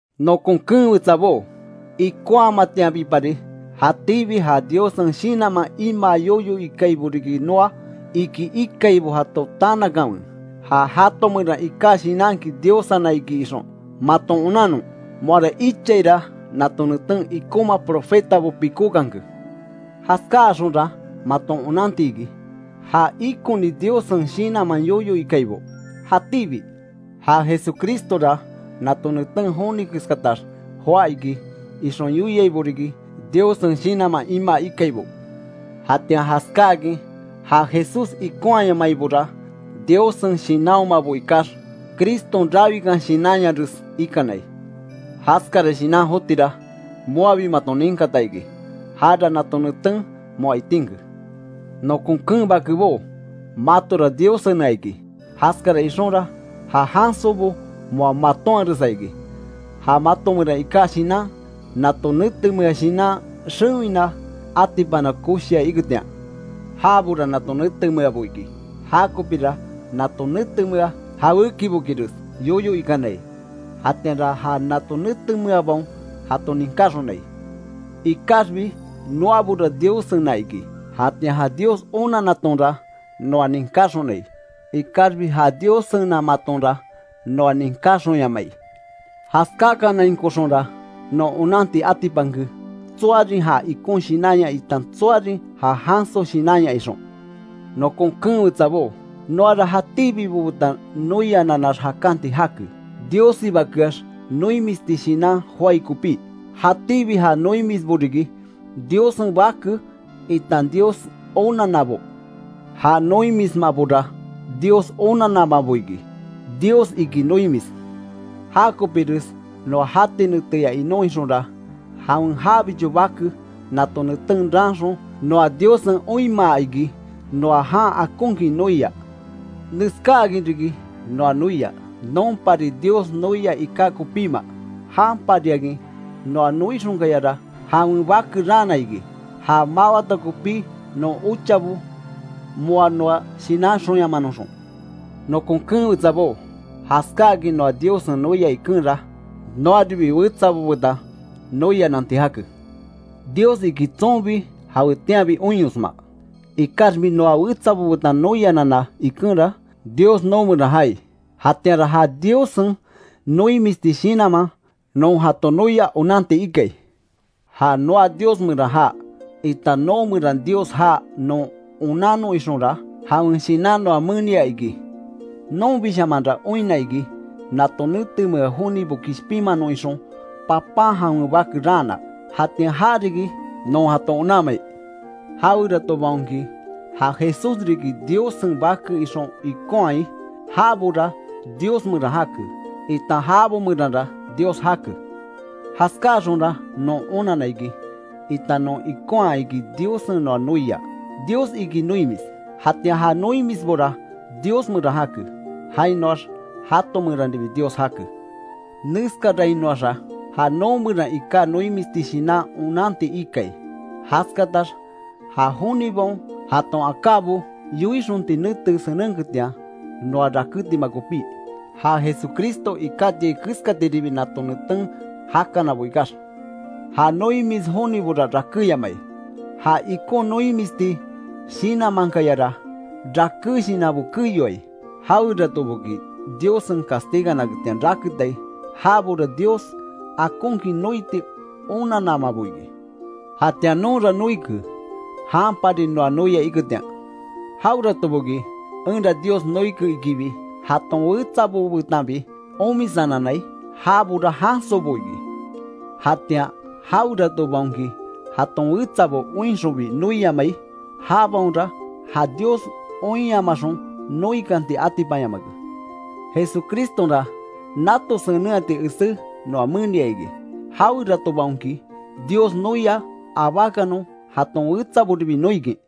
Nokon keen wetsabó, ikonhamatianbipari, jatíbi ja Diossen Shinanman imaa yoyo ikaibo riki noa, iki ikaibo jato tanakanwe, ja jato meran iká shinanki Diossena iki ixon, maton onannon. Moara ichaira nato neten ikonma profetabo pikókanke. Jaskaáxonra, maton onanti iki, ja ikoni Diossen Shinanman yoyo ikaibo. Jatíbi, ja Jesucristora nato neten joni keskatax joá iki, ixon yoiaibo riki, Diossen Shinanman imaa ikaibo. Jatian jaskaakin ja Jesús ikonhayamaibora, Diossen Shinanhomabo ikax, Criston rawikan shinanyares ikanai. Jaskara shinan jotira, moabi maton ninkata iki. Jara nato neten moa itinke. Nokon keen bakebó, matora Diossena iki. Jaskara ixonra, ja jansobo moa matoanharesa iki. Ja mato meran iká shinan, nato netemea shinan xewina atipana koshia iketian. Jabora nato netemeabo iki, jakopira nato netemea jawékibokires yoyo ikanai, jatianra ja nato netemeabaon jato ninkaxonai. Ikaxbi noabora Diossena iki. Jatian ja Dios onannatonra, noa ninkaxonai, ikaxbi ja Diossenamatonra, noa ninkáxonyamai. Jaskákanainkoxonra, non onanti atipanke, tsoarin ja ikon Shinanya itan tsoarin ja janso shinanya ixon. Nokon keen wetsabó, noara jatíbibo betan noiananax jakanti jake, Diossibakeax noimisti shinan joái kopí. Jatíbi ja noimisbo riki, Diossen bake itan Dios onannabo. Ja noimismabora Dios onannamabo iki. Dios iki noimis. Já kopires noa jati neteya inon ixonra, jawen jabicho Bake nato neten raanxon, noa Diossen oinmaa iki noa jan akonkin noia. Neskáakin riki noa noia: Nonpari Dios noia iká kopíma, janpariakin noa noixonkayara jawen Bake raana iki, já mawata kopí non ochabo moa noa shinanxonyamanoxon. Nokon keen wetsabó, jaskáakin noa Diossen noia ikenra, noaribi wetsabo betan noiananti jake. Dios iki tsonbi jawetianbi oinyosma, ikaxbi noa wetsabo betan noianana ikenra, Dios noo meran jaai, jatianra ja Diossen noimisti shinanman non jato noia onanti ikai. Ja noa Dios meran jaa, itan noo meran Dios jaa non onannon ixonra, jawen Shinan noa menia iki. Nonbishamanra oinna iki, nato netemea jonibo kishpinmanon ixon, Papan jawen Bake raana. Jatian ja riki non jato onanmai. Jaweratobaonki, ja Jesús riki Diossen Bake ixon ikonhai, jabora Dios meran jake, itan jabo meranra Dios jake. Jaskaáxonra non onanna iki, itan non ikonha iki Diossen noa noia. Dios iki noimis. Jatian ja noimisbora, Dios meran jake, jainoax jato meranribi Dios jake. Neskarainoaxa ja noo meran iká noimisti shinan onanti ikai; jaskatax ja jonibaon jaton akábo yoixonti nete senenketian noa rakétima kopí, ja Jesucristo ikátiai keskatiribi nato neten jakanabo ikax. Ja noimis jonibora, rakéyamai. Ja ikon noimisti shinanmankayara, raké shinanbo keyoai. Jaweratoboki Diossen castiganaketian raketai, jabora Dios akonkin noiti onannamabo iki. Jatian nonra noike, janpari noa noia iketian. Jaweratoboki enra Dios noike ikibi, jaton wetsabo betanbi omisananai, jabora jansobo iki. Jatian jaweratobaonki, jaton wetsabo oinxonbi noiamai, jabaonra ja Dios oinyamaxon, noikanti atipanyamake. Jesucristonra, nato senenhati esé noa menia iki, jaweratobaonki Dios noia, abákanon jaton wetsaboribi noikin.